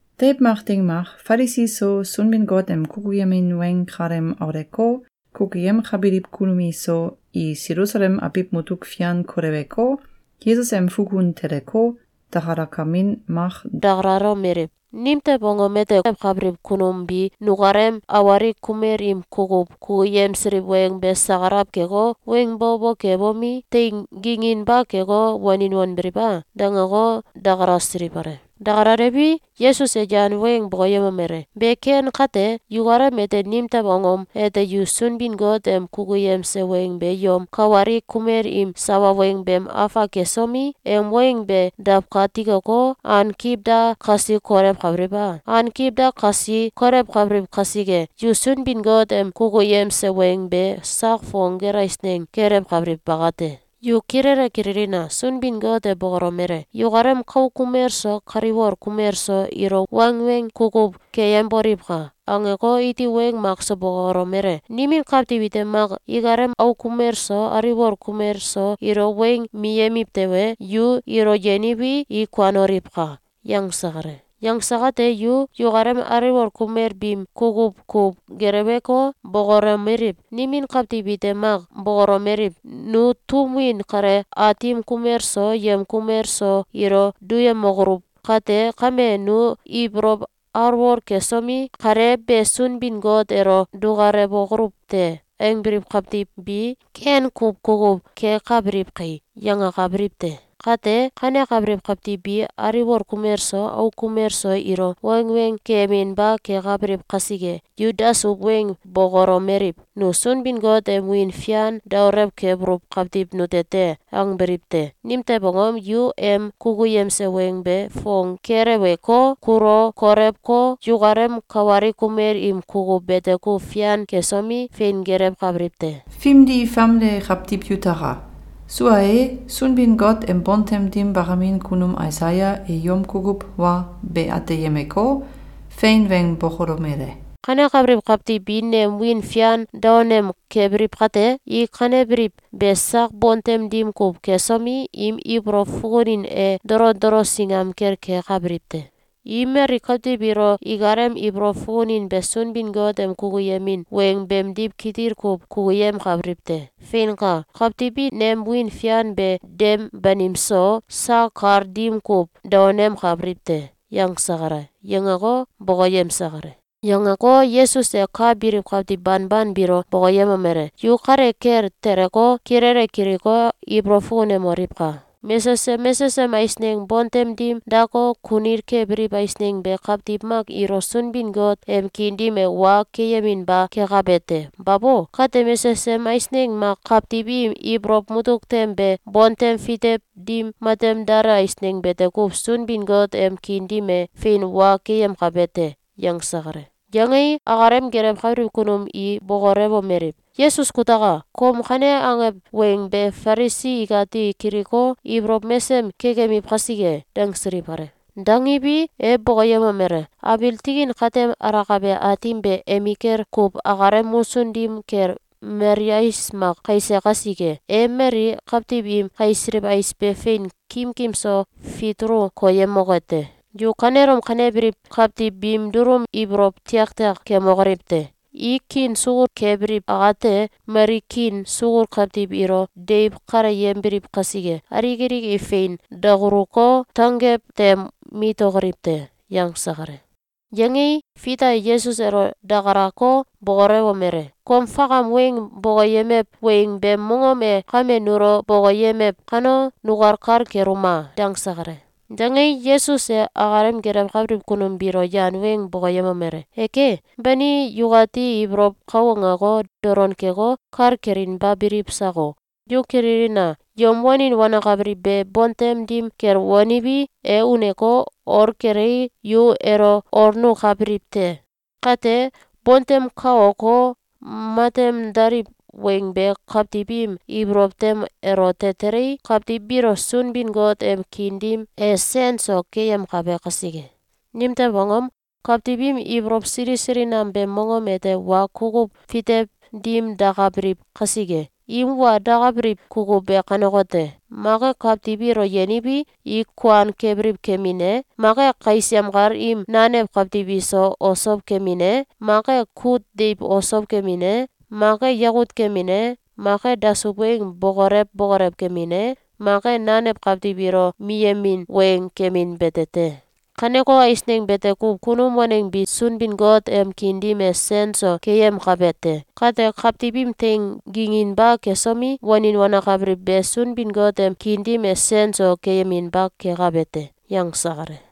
Deiw mak ding mak, Falisi so, Sunbin-Got em kukuyemin weng kalem auleko, kukuyemkabiliw kunum iso, i Selusalem abiw mutuk fian koleweko, Yesus em fukun teleko, dakalakamin mak dakalalomeliw: “Nimtew angom ete kom kenggelewkabiliw kunum bi nukalem awalik kumel im kukuw kukuyemsiliw weng be sakalaw keko, weng bo bo kebomi, teing ginginba keko, wanin wanbiliw a?”, dangeko, dakalasiliw kale. Dakalaliwi, Yesus e yan weng bokoyemomele: “Be ken kate, yukalem ete, nimtew angom ete yu Sunbin-Got em kukuyemse weng be yom kawalik kumel im sawa weng beem afak kesomi, em weng be dawkatikoko, ankiw da kasi kolewkabiliw a? Ankiw da kasi kolewkabiliw kasike, yu Sunbin-Got em kukuyemse weng be sak fong gel eisneng kelewkabiliw bakate. Yu kilele kililina! Sunbin-Got e bokolomele: ‘Yukalem kauk kumel so kaliwol kumel so ilo wangweng kukuw keyemboliwka!’, angeko, iti weng makso bokolomele: ‘Nimin kawtiw ite mak ikalem auk kumel so aliwol kumel so ilo weng miyemiw tewe, yu ilo yeniwi, i kuanoliwka!’, yangse kale. Yangse kate yu yukalem aliwol kumel biim kukuw kuw geleweko, bokolomeliw: ‘Nimin kawtiw ite mak bokolomeliw: ‘Nu tum win kale aatim kumel so yem kumel so ilo duyemokoluw kate kame, nu ibolow alwol kesomi, kale be Sunbin-Got elo dukalewokoluw te.’, angbiliw kawtiw bi ken kuw kukuw kekabiliw kai.’, yangakabiliw te. Kate, kanekabiliw kawtiw bi aliwol kumel so auk kumel so ilo wangweng keyeminba kekabiliw kasike, yu dasuw weng bokolomeliw: ‘Nu Sunbin-Got em wiin fian daolew kebuluw kawtiw nute te.’, angbiliw te. Nimtew angom? Yu em kukuyemse weng be fong keleweko, kulu kolewko, yukalem kawalik kumel im kukuw bete kuw fian kesomi, fein gelewkabiliw te. Fimdi famde kawtiw yutaka! Sua e, Sunbin-Got em bontem dim bakamin kunum Aisaya e yom kukuw wa be ateyemeko, fein weng bokolomele: ‘Kanekabiliw kawtiw bi nem wiin fian daonem kebiliw kate, i kanebiliw be sak bontem dim kuw kesomi, im ibolow fukunin e dolo dolo singam kel kekabiliw te. I mali kawtiw ilo ikalem ibolow fukunin be Sunbin-Got em kukuyemin weng beemdiw kitil kuw kukuyemkabiliw te. Feinka! Kawtiw bi nem wiin fian be dem banim so, sak kal dim kuw daonemkabiliw te.’, yangse kale.”, yangeko, bokoyemse kale. Yangeko, Yesus e ka biliw kawtiw banban biilo bokoyemomele: “Yu kale kel teleko, kilele kiliko, ibolow fukunemoliwka! Mesesem mesesem eisneng bontem dim dako, kunil kebiliw eisneng be kawtiw mak ilo Sunbin-Got em kiin dim e wa keyeminba kekabe te. Babo! Kate mesesem eisneng mak kawtiw im ibolow mutuk tem be bontem fitew dim matem dale eisneng bete kuw Sunbin-Got em kiin dim e fein wa keyemkabe te.”, yangse kale. Yangei, akalem gelewkabiliw kunum i bokolewomeliw: “Yesus kutaka! Kom kane angew weng be Falisi ikati kiliko, ibolow mesem kekemiw kasike!”, dangsiliw kale. Dangiwi, e bokoyemomele: “Abiil tikin katem alakabe Aatim be emikel kuw akalem musun dim kel mali ais mak kaise kasike, e mali kawtiw im kaisiliw ais be fein kimkim so fitulu koyemoke te. Yu kanelom kanebliw kawtiw biim dulum ibolow tiaktiak kemokoliw te! I kiin sukul kebiliw akate, mali kiin sukul kawtiw ilo deiw kaleyembiliw kasike, alik alik i fein dakuluko, tanggew tem mitokoliw te.”, yangse kale. Yangei, Fita e Yesus elo dakalako, bokolewomele: “Kom fakam weng bokoyemew weng beem mongom e kame nulo bokoyemew kano, nukal kal keluma!”, dangse kale. Dangei, Yesus e akalem gelewkabiliw kunum biilo yan weng bokoyemomele: “Eke! Bani yukati ibolow kau angeko, dolon keko, kal kelinba biliw sako? Yu kililina! Yom wanin wanakabiliw be bontem dim kel waniwi, e uneko, ol kelei, yu elo olnukabiliw te. Kate, bontem kaoko, matem daliw weng be kawtiw im ibolow tem elote telei, kawtiw biilo Sunbin-Got em kiin dim e sen so keyemkabe kasike. Nimtew angom? Kawtiw im ibolow sili sili nam beem mongom ete wa kukuw fitew dim dakabiliw kasike. Im wa dakabiliw kukuw be kanekote: Mak e kawtiw ilo yeniwi, i kuan kebiliw kemin e, mak e kais yemkal im nanew kawtiw iso osow kemin e, mak e kut deiw osow kemin e, mak e yakut kemin e, mak e dasuw weng bokolew bokolew kemin e, mak e nanew kawtiw ilo miyemin weng kemin bete te. Kaneko eisneng bete kuw kunum waneng bi Sunbin-Got em kiin dim e sen so keyemkabe te. Kate, kawtiw im teing ginginba kesomi, wanin wanakabiliw be Sunbin-Got em kiin dim e sen so keyeminba kekabe te.”, yangse kale.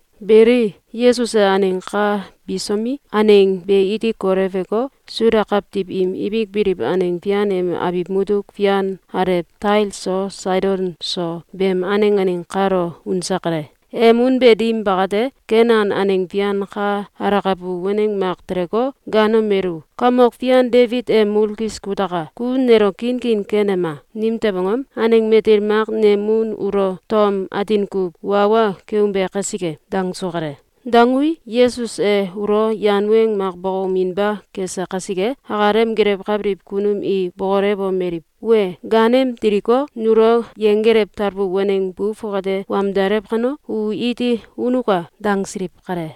Beli, Yesus e aneng ka bisomi, aneng be iti koleweko, Suda kawtiw im ibik biliw aneng fian em abiw mutuk fian alew Tail so Saidon so beem aneng aneng kalo unse kale. Em unbe dim bakate, Kenan aneng fian ka alakabu waneng mak teleko, gaanomelu: “Kamok Fian Debit em mulkis kutaka! Ku nelo kinkin kenema! Nimtew angom? Aneng matil mak nem mun ulo tom atin kuw wa wa keumbe kasike!”, dangsu kale. Dangui, Yesus e ulo yan weng mak bokouminba kese kasike, akalem gelewkabiliw kunum i bokolewomeliw: “Wee! Gaanem diliko, nulo yenggelew talbu waneng bu fongate wamdalew kano, u iti unuka.”, dangsiliw kale.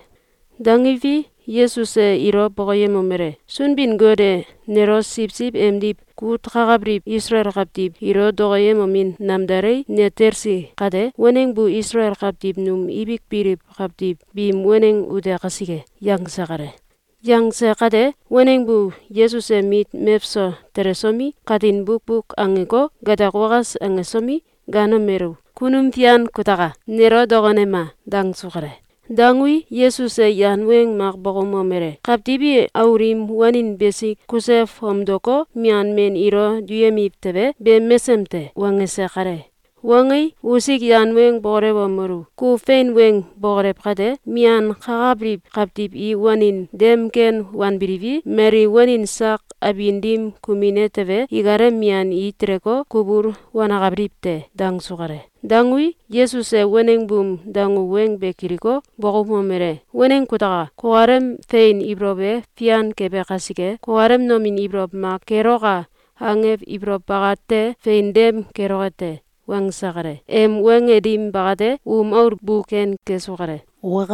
Dangiwi, Yesus e ilo bokoyemomele: “Sunbin-Got e nelo siwsiw emdiw kut kakabiliw Isalael kawtiw ilo dokoyemomin namdalei, ne talsi kate, waneng bu Isalael kawtiw num ibik biliw kawtiw biim waneng ute kasike.”, yangse kale. Yangse kate, waneng bu Yesus em mit mewso telesomi, katin bukbuk angeko, gatak wakas angesomi, gaanomelu: “Kunum Fian kutaka! Nelo dokonema!”, dangsu kale. Dangui, Yesus e yan weng mak bokoumomele: “Kawtiw i aul im wanin besik kuse fomdoko, mian men ilo duyemiw tewe, be mesem te!”, wangese kale. Wangei, usik yan weng bokolewomelu: “Ku fein weng bokolew kate, mian kakabiliw kawtiw i wanin dem ken wanbiliwi, mali wanin sak abin dim kumine tewe, ikalem mian i teleko, kubul wanakabiliw te.”, dangsu kale. Dangui, Yesus e waneng buum dangu weng be kiliko, bokoumomele: “Waneng kutaka! Kukalem fein ibolow e fian kebe kasike, kukalem nomin ibolow mak ‘Keloka!’, angew ibolow bakate fein dem keloke te!”, wangse kale. Em wange dim bakate, um aul bu ken kesu kale.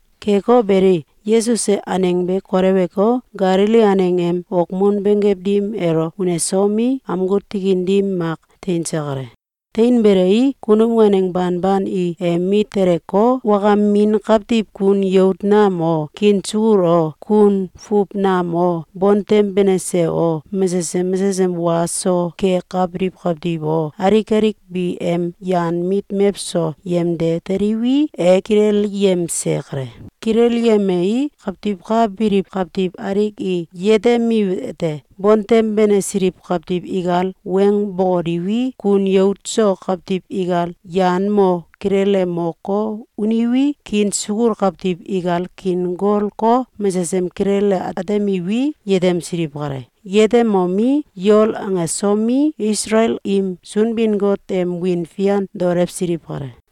Keko beli, Yesus e aneng be koleweko, Galili aneng em okmun benggew dim elo unesomi, amgu tikin dim mak teinse kale. Teinbelei, kunum waneng banban i em mit teleko, wakamin kawtiw kun yout nam o, kiin sukul o, kun fuw nam o, bontem benese o, mesesem mesesem wa so kekabiliw kawtiw o, alik alik bi em yan mit mewso yemde teliwi, e kilelyemse kale. Kilelyemei, kawtiw ka biliw kawtiw alik i yetemiwete: Bontem benesiliw kawtiw ikal weng bokoliwi, kun yout so kawtiw ikal yan mo kilele moko, uniwi, kiin sukul kawtiw ikal kiin golko, mesesem kilele atemiwi, yetemsiliw kale. Yetemomi, yol angesomi, Isalael im Sunbin-Got em wiin fian daolewsiliw kale.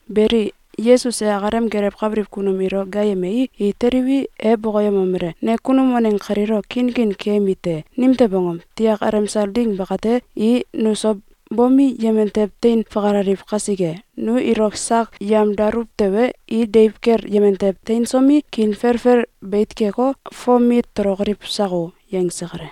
Beli, Yesus e akalem gelewkabiliw kunum ilo gaayemei, i teliwi, e bokoyemomele: “Ne kunum waneng kalilo kinkin keyemi te. Nimtew angom? Tiak alemsal ding bakate, i nuso bomi, yemen tew tein fakalaliw kasike. Nu ilo sak yemdaluw tewe, i deiw kel yemen tew teinsomi, kiin felfel beit keko, fom mit tolokoliw sako!”, yangse kale.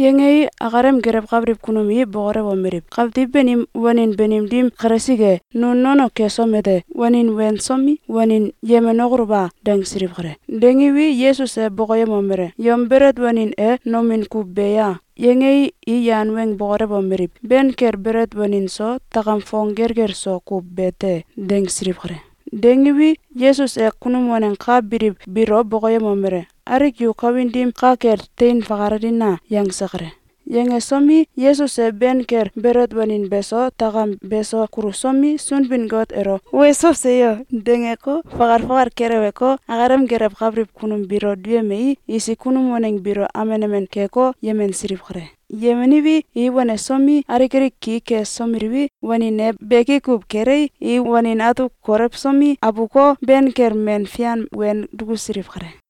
Yangei, akalem gelewkabiliw kunum i bokolewomeliw: “Kawtiw banim wanin banim dim kalesik e, nu nono kesom ete, wanin wensomi, wanin yemenokoluw a?”, dangsiliw kale. Dangiwi, Yesus e bokoyemomele: “Yom belet wanin e nolin kuw be ya?”, yangei, i yan weng bokolewomeliw: “Ben kel belet wanin so takam fong gelgel so kuw bete.”, dangsiliw kale. Dangiwi, Yesus e kunum waneng ka biliw biilo bokoyemomele: “Alik yu kawin dim ka kel tein fakalalina!”, yangse kale. Yangesomi, Yesus e ben kel belet wanin beso takam beso kulusomi, Sunbin-Got elo “Weso! Seyo!”, dangeko, fakal fakal keleweko, akalem gelewkabiliw kunum biilo duyemei, isik kunum waneng biilo amen amen keko, yemensiliw kale. Yemeniwi, i wanesomi, alik alik ki ksomeliwi, wanin e beki kuw kelei, i wanin atuk kolewsomi, abuko, ben kel men fian wen dukusiliw kale.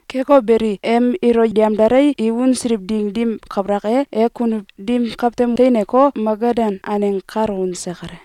Keko beli, em ilo yemdalei, i unsiliw ding dim kabalak e, e kunuw dim kawtem teineko, Magadan aneng kalo unse kale.